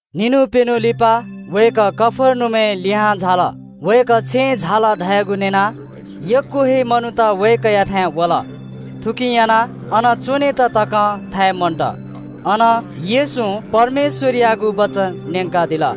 छुं दिं लिपा वय्‌कः कफर्नहुमय् लिहां झाल। वय्‌कः छेँय् झाल धयागु न्‍यनाः यक्‍व हे मनूत वय्‌कःयाथाय् वल। थुकिं यानाः अन लुखाया पिने तक नं च्‍वनेत थाय् मन्‍त। अन येशूं परमेश्‍वरयागु वचन न्‍यंकादिल।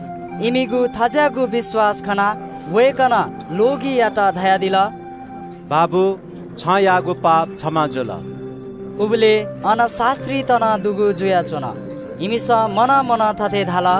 इमिगु थज्‍याःगु विश्‍वास खनाः वय्‌कलं ल्‍वगियात धयादिल – “छं याःगु पाप क्षमा जुल।” उबलय् अन शास्‍त्रीत नं दुगु जुयाच्‍वन। इमिसं मनं मनं थथे धाल –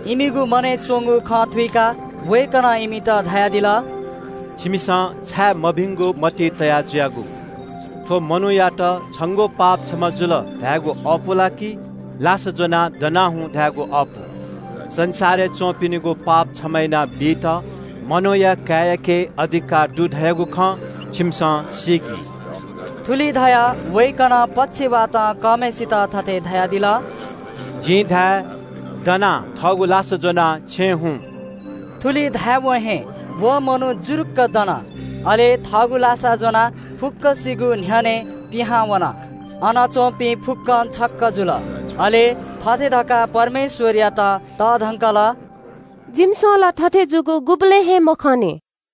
इमिगु मनय् च्‍वंगु खँ थत्‍थें थःगु आत्‍माय्‌ थुइकाः वय्‌कलं इमित धयादिल – “छिमिसं छाय् मभिंगु मतिइ तया जुयागु? थ्‍व मनूयात ‘छंगु पाप क्षमा जुल’ धायेगु अःपु ला कि ‘लासा ज्‍वनाः दना हुँ’ धायेगु अःपु? संसारय् च्‍वंपिनिगु पाप क्षमा यानाबीत मनूया काय्‌याके अधिकार दु धयागु खँ छिमिसं सीकि।” थुलि धयाः वय्‌कलं पक्षवातं कःम्‍हय्‌सित थथे धयादिल – “जिं छन्‍त धाये – दनाः थःगु लासा ज्‍वनाः छेँ हुँ।” थुलि धायेवं हे व मनू जुरुक्‍क दनाः थःगु लासा ज्‍वनाः फुक्‍कसिगु न्‍ह्यःनें पिहां वन। अन च्‍वंपिं फुक्‍कं छक्‍क जुल। अले थथे धकाः परमेश्‍वरयात तःधंकल – “जिमिसं ला थथे जूगु गुबलें हे मखंनि।”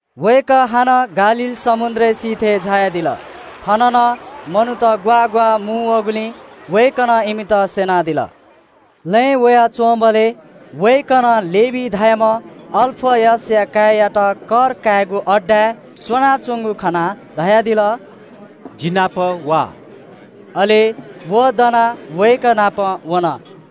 वय्‌कः हानं गालील समुद्र सिथय् झायादिल। थन नं मनूत ग्‍वाः ग्‍वाः मुंवःगुलिं वय्‌कलं इमित स्‍यनादिल। लँय् वयाच्‍वंबलय् वय्‌कलं लेवी धाःम्‍ह अल्‍फयसया काय्‌यात कर कायेगु अड्डाय् च्‍वनाच्‍वंगु खनाः धयादिल – “जि नाप वा।” अले व दनाः वय्‌कः नाप वन।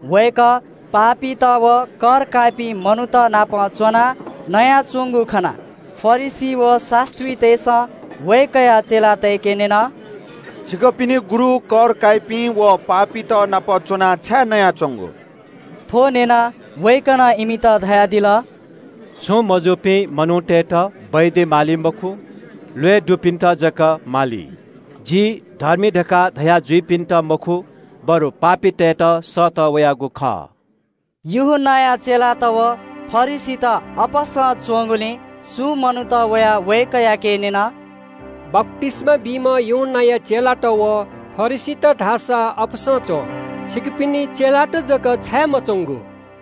वय्‌कः पापीत व कर काइपिं मनूत नाप च्‍वनाः नयाच्‍वंगु खनाः फरिसी व शास्‍त्रीतय्‌सं वय्‌कःया चेलातय्‌के न्‍यन – “थज्‍याःपिं मनूतलिसे च्‍वनाः छाय् नयाच्‍वंगु व?” थ्‍व न्‍यनाः वय्‌कलं इमित धयादिल – “छुं मजूपिं मनूतय्‌त डाक्‍टर माली मखु, ल्‍वय् दुपिन्‍त जक माली। जि धर्मीतय्‌त मखु बरु पापीतय्‌त सःतः वयागु खः।” यूहन्‍नाया चेलात व फरिसीत अपसं च्‍वंगुलिं सुं मनूत वयाः वय्‌कःयाके न्‍यन – “बप्‍तिस्‍मा बीम्‍ह यूहन्‍नाया चेलात अपसं च्‍वं, फरिसीत अपसं च्‍वं, छिकपिनि चेलात जक छाय् मच्‍वंगु?”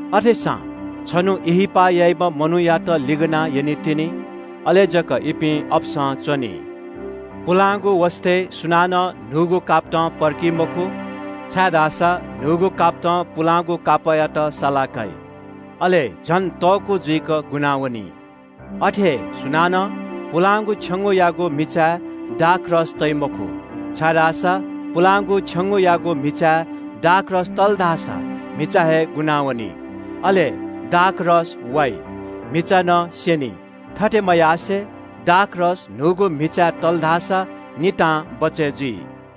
अथेसां छन्‍हु ब्‍याहा याइम्‍ह मिजंयात यंकितिनि। अले जक इपिं अपसं च्‍वनी।” “पुलांगु वसतय् सुनानं न्‍हूगु कापतं पर्की मखु, छाय्‌धाःसा न्‍हूगु कापतं पुलांगु कापःयात साला काइ, अले झन तःकू जुइक गुनावनी। “अथे हे सुनानं पुलांगु छेंगूयागु म्‍हिचाय् दाखमद्य तइ मखु, छाय्‌धाःसा पुलांगु छेंगूयागु म्‍हिचाय् दाखमद्य तल धाःसा म्‍हिचा हे गुनावनी, अले दाखमद्य वाइ, म्‍हिचा नं स्‍यनी। थथे मयासें दाखमद्य न्‍हूगु म्‍हिचाय् तल धाःसा नितां बचय् जुइ।”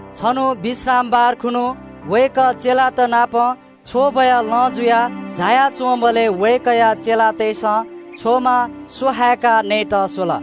छन्‍हु विश्रामबार खुन्‍हु वय्‌कः चेलात नाप छ्वबया लँ जुयाः झाया च्‍वंबलय् वय्‌कःया चेलातय्‌सं छ्वमा स्‍वहाय्‌काः नयेत स्‍वल।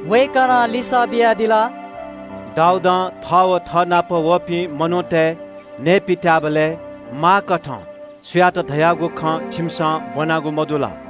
वय्‌कलं लिसः बियादिल – “दाऊदं थः व थःनाप वःपिं मनूतय् नये पित्‍याःबलय् माःकथं छु यात धयागु खँ छिमिसं ब्‍वनागु मदु ला?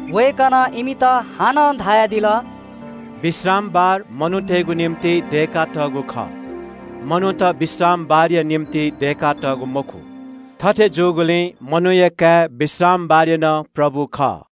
वय्‌कलं इमित हानं धयादिल – “विश्रामबार मनूतय्‌गु निंतिं दय्‌कातःगु खः, मनूत विश्रामबारया निंतिं दय्‌कातःगु मखु। थथे जूगुलिं मनूया काय् विश्रामबारया नं प्रभु खः।”